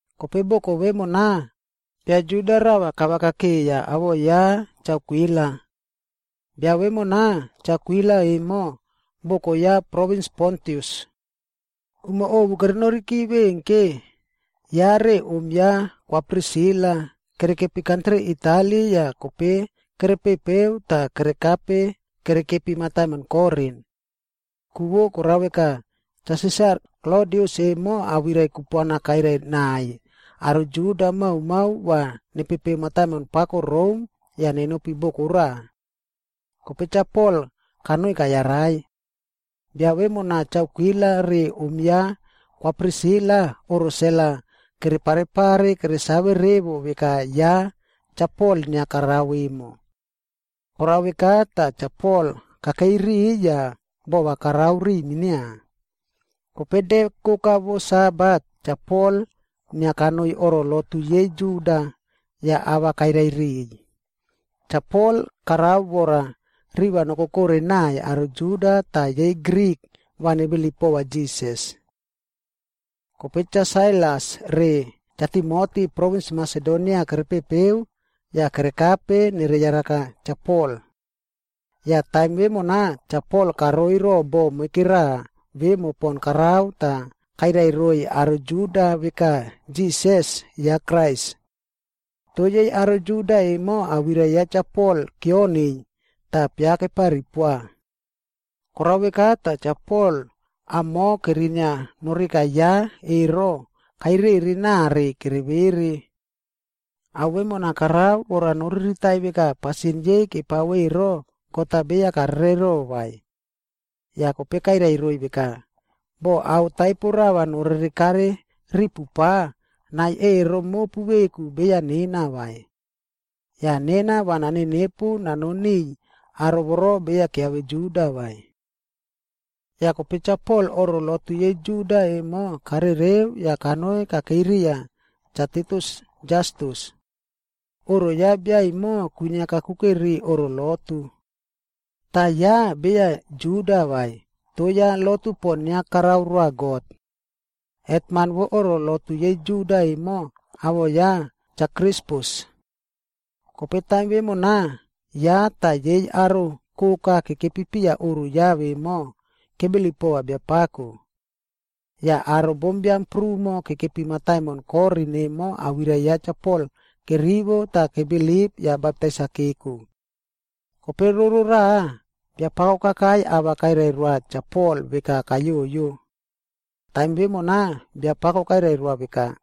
Kope boko vemona, bia Juda rava kavakakeiya awoꞌo ya Cha Akwila. Bia vemona Cha Akwila emo, boko ya provins Pontus. Umo ovu kerenoriki veꞌen ke, ya re om ya Kwa Prisila kerekepi kantri Itali yah kope kerepepeu tah kerekape kerekepi mataimon Korin. Ku korao veka, Cha Sisar Klodius emo awirai kupuana kairai naiy aro Juda maomao va nepepeu mataimon pako Rom yah nenopi boko raꞌa. Kope Cha Pol kanoi kayarai. Bia vemona Cha Akwila re om ya Kwa Prisila, oꞌro sel-a kere parepare keresave revo veka ya Cha Pol inia karao emo. Korao veka tah Cha Pol kakeiy riꞌiy yah bova karao riꞌiy minia. Kope de koka vo Sabat, Cha Pol inia kanoi oꞌro lotu yei Juda yah ava kairai riꞌiy. Cha Pol karao vora riva nokokore naiy aro Juda tah yei Grik va nebilip pova Jisas. Kope Cha Sailas re Cha Timoti provins Masedonia kerepepeu yah kerekape nereyaraka Cha Pol. Yah taim vemona, Cha Pol karoiy ro bo moikera vemo pon karao tah kairai roiy aro Juda veka Jisas, ya Krais. Toh yei aro Juda emo awirai ya Cha Pol kioniy tah piakepari poa. Korao veka tah Cha Pol amoꞌo kerinia noreka ya ero kairere nare kere vere. Ao vemona karao vora noriritai veka pasin yei kepao ero, God-a beya karerero vai. Yah kope kairai roiy veka, “Boh ao taipo rava norerekare ripu pa, nai ero mopu veku beya nena vai. Yah nena va nanenepu nanon niꞌiy aro voro beya kiave Juda vai.” Yah kope Cha Pol oꞌro lotu yei Juda emo karereu yah kanoi kakeiy riya Cha Titius Jastus. Oꞌro ya bia emo kwinia kakuke ri oꞌro lotu. Tah ya beya Juda vai, toh ya lotu pon inia karao roa God. Hetman vo oꞌro lotu yei Juda emo, awoꞌo ya Cha Krispus. Kope taim vemona, ya tah yei aro koka kekepi piya oꞌro ya vemo, kebilip pova Biapako. Yah aro bombiam prumo kekepi mataimon Korin emo awirai ya Cha Pol kerivo tah kebilip yah baptais-a keko. Kope roro raꞌa, Biapako kakai ava kairai roa Cha Pol veka kayoyo. Taim vemona, Biapako kairai roa veka,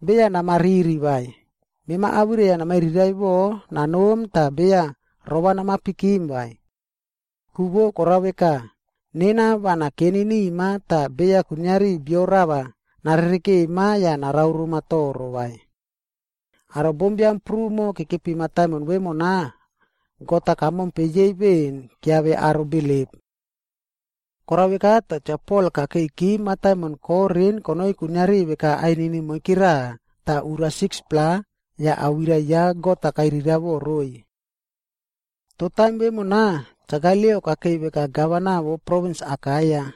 “Beya nama riri vai, mema awirai-a namairiraiꞌvo nanom tah beya ro-a nama pikim vai. Ku vo korao veka, nena va nakeni nima tah beya kuiniari bio rava narerekema yah narao roma toro vai. Aro bombiam prumo kekepi mataimon vemona God-a kamompe yei veꞌen kiave aro bilip.” Korao veka tah Cha Pol kakeiki mataimon Korin konoi kuiniari veka ainini moikera tah ura 6-pla yah awirai ya God-a kairiraiꞌvo roiy. Toh taim vemona, Cha Galio kakei veka gavana vo provins Akaia.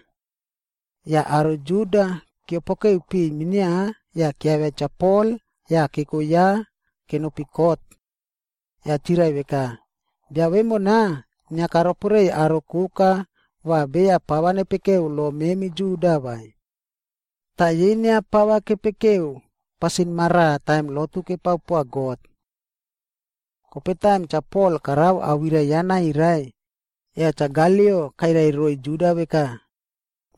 Yah aro Juda keopokeu piꞌiy minia yah kiavia Cha Pol yah keko ya kenopi kot. Yah chirai veka, “Bia vemona inia karoporeiy aro koka va beya pava nepekeu lo memi Juda vai. Tah yei inia pava kepekeu pasin maraꞌa taim lotu kepao poa God.” Kope taim Cha Pol karao awirai ya nairai, yah Cha Galio kairai roiy Juda veka,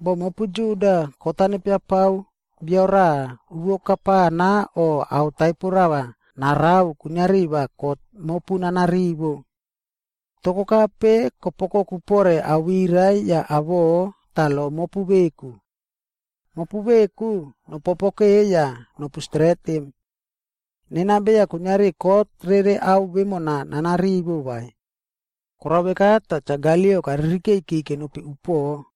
“Boh mopu Juda kot-a nepia pao bio raꞌa uvo kapana o ao taipo rava narao kuiniari va kot mopu nana rivo. Toh kokape kopu oukoku pore awirai yah awoꞌo tah lo mopu veku. Mopu veku nopopokeu yah nopu stretim. Nena beya kuiniari kot rere ao vemona nana rivo vai.” Korao veka tah Cha Galio karirikeiki kenopi upoꞌo.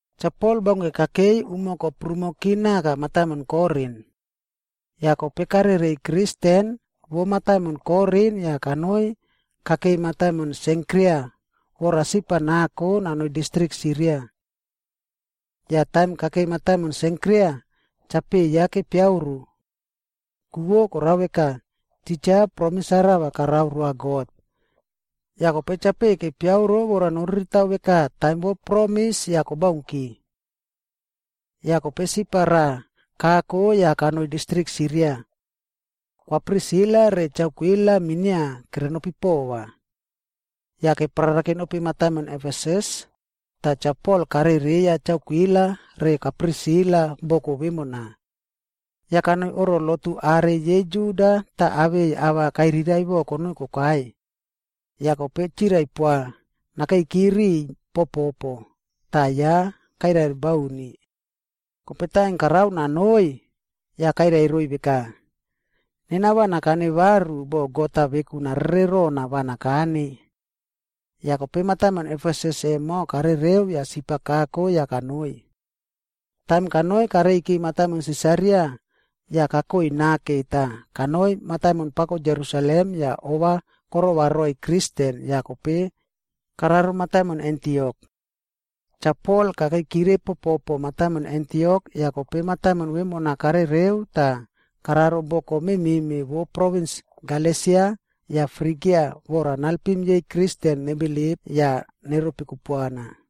Cha Pol baunke kakei umo koprumoki naka mataimon Korin. Yah kope karereiy Kristen vo mataimon Korin yah kanoi kakeiy mataimon Senkria vora sip-a nako nanoiy distrik Siria. Yah taim kakei mataimon Senkria, chapeꞌe ya kepiaꞌoro. Ku vo korao veka, titja promis-a rava karao roa God. Yah kope chapeꞌe kepiaꞌoro vora noriritao veka taim vo promis yah kobaunki. Yah kope sip-a raꞌa kako yah kanoi distrik Siria. Kwa Prisila re Cha Akwila minia kerenopi pova. Yah keparara kenopi mataimon Efesus, tah Cha Pol karereiya Cha Akwila re Kwa Prisila boko vemona. Yah kanoi oꞌro lotu are yei Juda tah awei ava kairiraiꞌvo konoi kokai. Yah kope chirai poa nakeiki riꞌiy popo, tah ya kairai bauni. Kope taim karao nanoi, yah kairai roiy veka, “Nena va nakane varu boh God-a veku narere rona va nakane.” Yah kope mataimon Efesus emo karereu yah sip-a kako yah kanoi. Taim kanoi kareiki mataimon Sisaria, yah kakoi nake tah kanoi mataimon pako Jerusalem yah ova korova roiy Kristen yah kope kararo mataimon Antiok. Cha Pol kakeikire popo mataimon Antiok yah kope mataimon vemona karereu tah kararo boko memeꞌme vo provins Galesia yah Frigia vora nalpim yei Kristen nebilip yah neropi kupuana.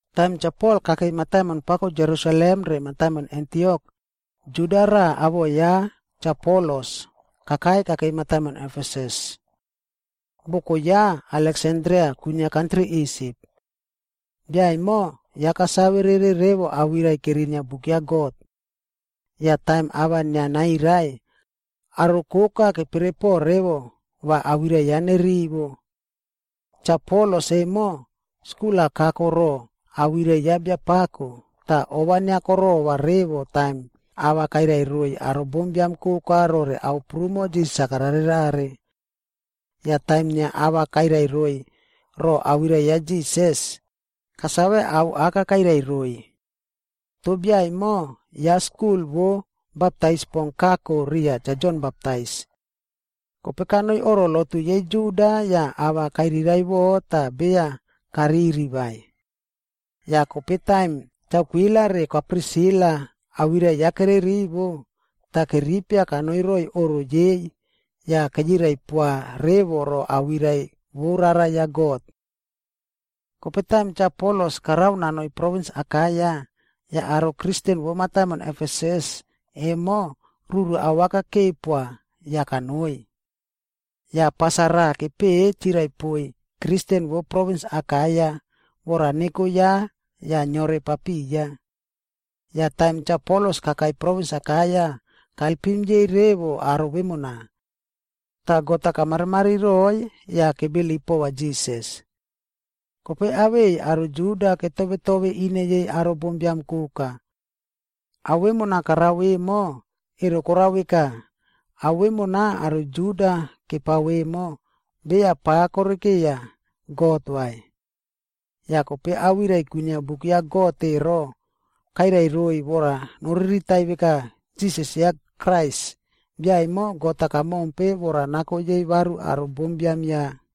Taim Cha Pol kakeiy mataimon pako Jerusalem re mataimon Antiok, Juda raꞌa awoꞌo ya Cha Apolos kakai kakeiy mataimon Efesus. Boko ya, Aleksandria kwinia kantri Isip. Bia emo ya kasave rere revo awirai kerinia Buk ya God. Yah taim ava inia nairai, aro koka keperepo revo va awirai ya nerivo. Cha Apolos emo, skul-a kako ro awirai ya Biapako tah ova inia korova revo taim ava kairai roiy aro bombiam koka rore ao prumo Jisas-a kararerare. Yah taim inia ava kairai roiy ro awirai ya Jisas, kasave ao aka kairai roiy. Toh bia emo ya skul vo baptais pon kako riya Cha Jon Baptais. Kope kanoi oꞌro lotu yei Juda yah ava kairiraiꞌvo tah beya kariri vai. Yah kope taim Cha Akwila re Kwa Prisila awirai ya kererivo, tah keripia kanoi roiy oꞌro yei yah keyirai poa revo ro awirai vo Rara ya God. Kope taim Cha Apolos karao nanoi provins Akaia, yah aro Kristen vo mataimon Efesus emo ruru awaka kepoa yah kanoi. Yah pas-a raꞌa kepeꞌe chirai poiy Kristen vo provins Akaia vora neko ya yah neore papiya. Yah taim Cha Apolos kakai provins Akaia, kalpim yei revo aro vemona. Tah God-a kamarimari roiy yah kebilip pova Jisas. Kope awei aro Juda ketove tove ine yei aro bombiam koka. Ao vemona karao emo, ero korao veka, ao vemona aro Juda kepao emo, beya pa korekeiya God vai. Yah kope awirai kwinia Buk ya God ero, kairai roiy vora noriritai veka, Jisas ya Krais, bia emo God-a kamompe vora nako yei varu aro bombiam ya.